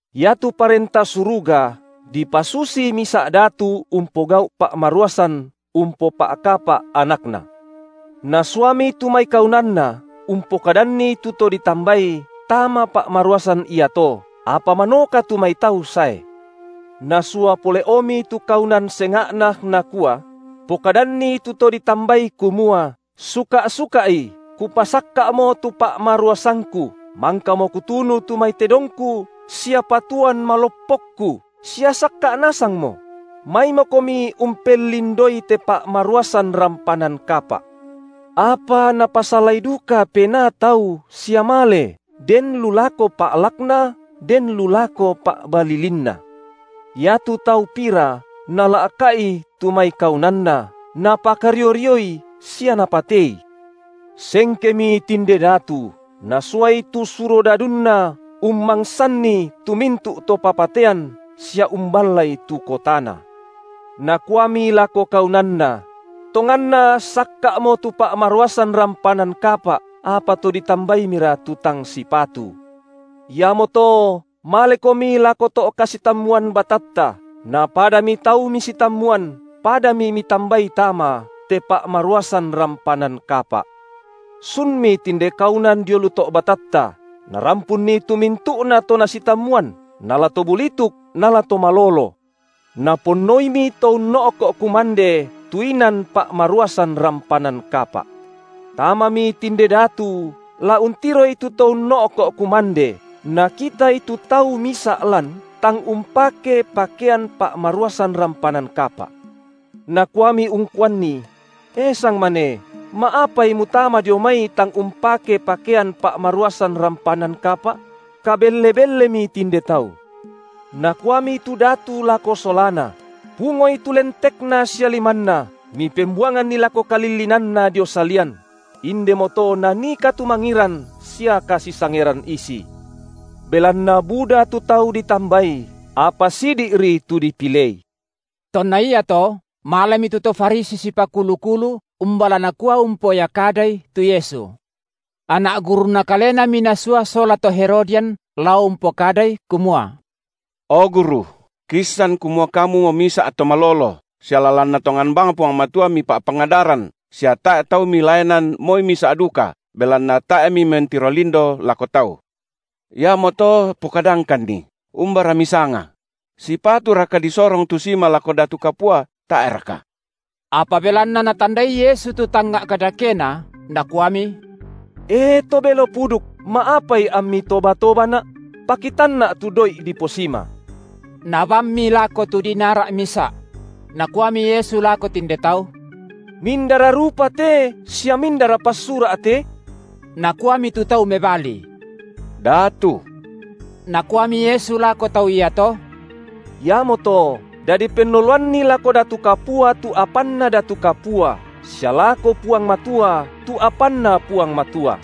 Iatu Parenta Suruga dipasusi misa’ datu umpogau’ pa’maruasan umpopa’kapa’ anakna. Nasuami tu mai kaunanna umpokadanni tu to ditambai tama pa’maruasan iato, apa manoka tu mai tau sae. Nasua pole’omi tu kaunan senga’na, nakua: Pokadanni tu to ditambai kumua: suka’-suka’i, kupasakka’mo tu pa’maruasangku, mangkamo kutunu tu mai tedongku sia patuoan maloppokku, sia sakka’ nasangmo; maimokomi umpellindoi te pa’maruasan rampanan kapa’. Apa napasalai duka penaa tau sia male, den lu lako pa’lakna, den lu lako pa’balilinna. Ia tu tau pira nala’ka’i tu mai kaunanna, napakario-rioi sia napatei. Sengkemi tinde datu, nasuai tu surodadunna ummangsanni tu mintu’ to papatean sia umballai tu kotana. Nakuami lako kaunanna: Tonganna sakka’mo tu pa’maruasan rampanan kapa’, apa to ditambaimira tu tang sipatu. Iamoto malekomi lako to’ kasitammuan batatta, na padami tau misitammuan, padami mitambai tama, te pa’maruasan rampanan kapa’. Sunmi tinde kaunan dio lu to’ batatta, narampunni tu mintu’nato nasitammuan, nala to bulituk nala to malolo. Naponnoimi to unno’ko’ kumande tu inan pa’maruasan rampanan kapa’. Tamami tinde datu la untiroi tu to unno’ko’ kumande nakitai tu tau misa’ lan tang umpake pakean pa’maruasan rampanan kapa’. Nakuami ungkuanni: E sangmane, ma’apai mutama dio mai tang umpake pakean pa’maruasan rampanan kapa’? Kabelle-bellemi tinde tau. Nakuami tu datu lako solana: Pungoi tu lentekna sia limanna, mipembuanganni lako kalillinanna dio salian; indemoto nanii katumangiran sia kasisangeran isi. Belanna buda tu tau ditambai, apa sidi’ri tu dipilei. Tonna iato malemi tu to Farisi sipakulu-kulu umba la nakua umpoya kadai tu Yesu. Anak gurunna kalenami nasua sola to Herodian lao umpokadai kumua: O Guru, kiissan kumua Kamumo misa’ to malolo, sia lalanna tongan bang Puang Matua Mipa’pangadaran, sia tae’ tau Milaenan moi misa’ duka, belanna tae’ Mimentiro lindo lako tau. Iamoto pokadangkanni, umbara Misanga? Sipaturaka disorong tu sima lako datu kapua, tae’raka? Apa belanna Natandai Yesu tu tangnga’ kadakena, Nakuami: E to belo puduk, ma’apai ammi toba-tobaNa’? PakitanNa’ tu doi’ diposima. Nabammi lako tu dinara’ misa’. Nakuami Yesu lako tinde tau: Mindara rupa te sia mindara passura’ te? Nakuami tu tau mebali: Datu. Nakuami Yesu lako tau iato: Iamoto dadi pennoloanni lako datu kapua tu apanna datu kapua, sia lako Puang Matua tu apanNa Puang Matua.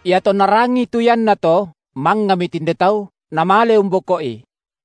Iatonna rangii tu iannato, mangngami tinde tau, namale umboko’i.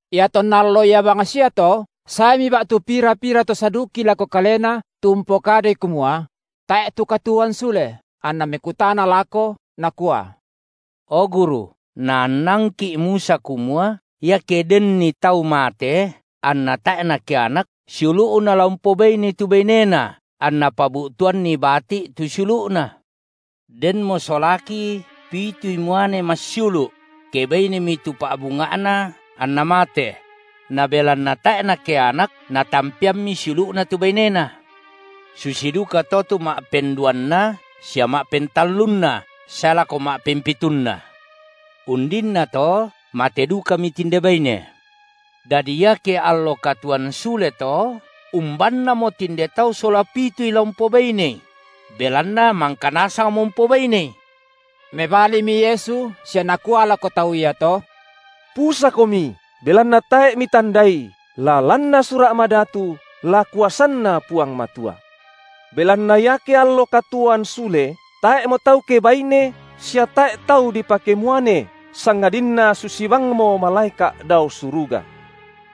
Iatonna allo ia bangsiato, saemi ba’tu pira-pira to Saduki lako Kalena tu umpokadai kumua: tae’ tu katuoan sule, anna mekutana lako, nakua: O Guru, naannangki’ Musa kumua, iake denni tau mate, anna tae’ nakeanak, siulu’na la umpobainei tu bainena anna pabu’tuanni bati’ tu siulu’na. Denmo solaki pitui muane massiulu’; kebainemi tu pa’bunga’na anna mate; na belanna tae’ nakeanak, natampeammi siulu’na tu bainena. Susi dukato tu ma’penduanna sia ma’pentallunna sae lako ma’pempitunna. Undinnato mate dukami tinde baine. Dadi iake allo katuoan sule to, umbannamo tinde tau sola pitui la umpobainei? Belanna mangka nasangmo umpobainei. Mebalimi Yesu sia Nakua lako tau iato: Pusakomi, belanna tae’ mitandai la lanna Sura’ madatu la kuasanNa Puang Matua. Belanna iake allo katuoan sule, tae’mo tau kebaine sia tae’ tau dipakemuane, sangadinna susi bangmo malaeka’ dao suruga.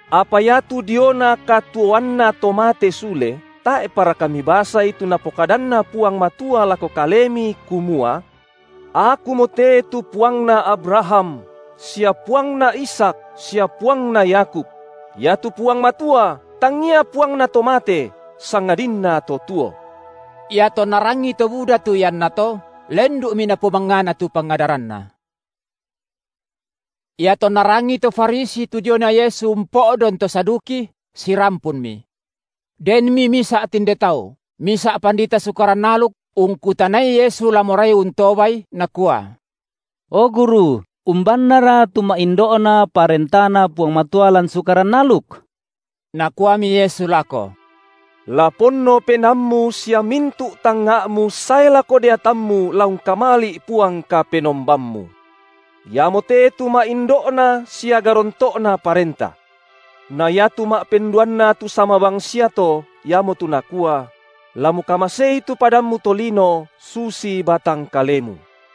Apa iatu diona katuoanna to mate sule, tae’paraka mibasai tu NapokadanNa Puang Matua lako kalemi, kumua: Akumote tu Puangna Abraham, sia Puangna Ishak, sia Puangna Yakub? Iatu Puang Matua tangia Puangna to mate, sangadinna to tuo. Iatonna rangii to buda tu iannato, lendu’mi napomangngana tu pangadaranNa. Iatonna rangii to Farisi tu diona Yesu umpo’don to Saduki, sirampunmi. Denmi misa’i tinde tau, misa’ pandita Sukaran aluk ungkutanai Yesu la morai untobal, nakua: O guru, umbannara tu ma’indo’na parentaNa Puang Matua lan Sukaran aluk? Nakuami Yesu lako: La ponno penaammu sia mintu’ tangnga’mu sae lako deatammu la ungkamali’ Puang Kapenombammu. Iamote tu ma’indo’na sia garonto’na parenta. Na iatu ma’penduanna tu sama bangsiato, iamotu nakua: La mukamasei tu padammu tolino susi batang kelemu.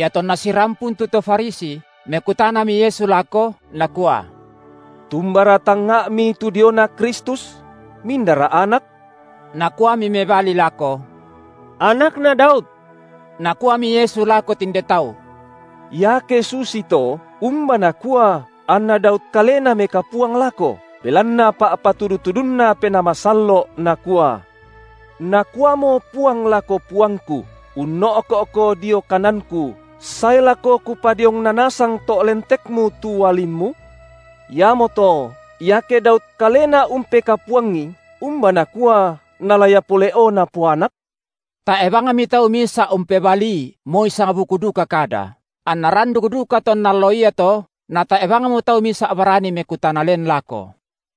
Iatonna sirampun tu to Farisi, mekutanami Yesu lako, Nakua: Tumbara tangnga’mi tu diona Kristus? Mindara Anak? Nakuami mebali lako: Anakna Daud. Nakuami Yesu lako tinde tau: Iake susito, umba nakua anna Daud kalena mekapuang lako, belanna pa’patudu-tudunNa Penaa Masallo’, nakua: Nakuamo Puang lako Puangku: unno’ko’Ko dio kananKu, sae lako Kupadiongna nasang to’ lentekMu tu ualimMu? Iamoto iake Daud kalena umpekapuangi, umba nakua nala Ia pole’o napoanak? Tae’ bangmi tau misa’ umpebalii moi sangbuku duka kada, anna randuk duka tonna allo iato natae’ bangmo tau misa’ barani mekutana len lako.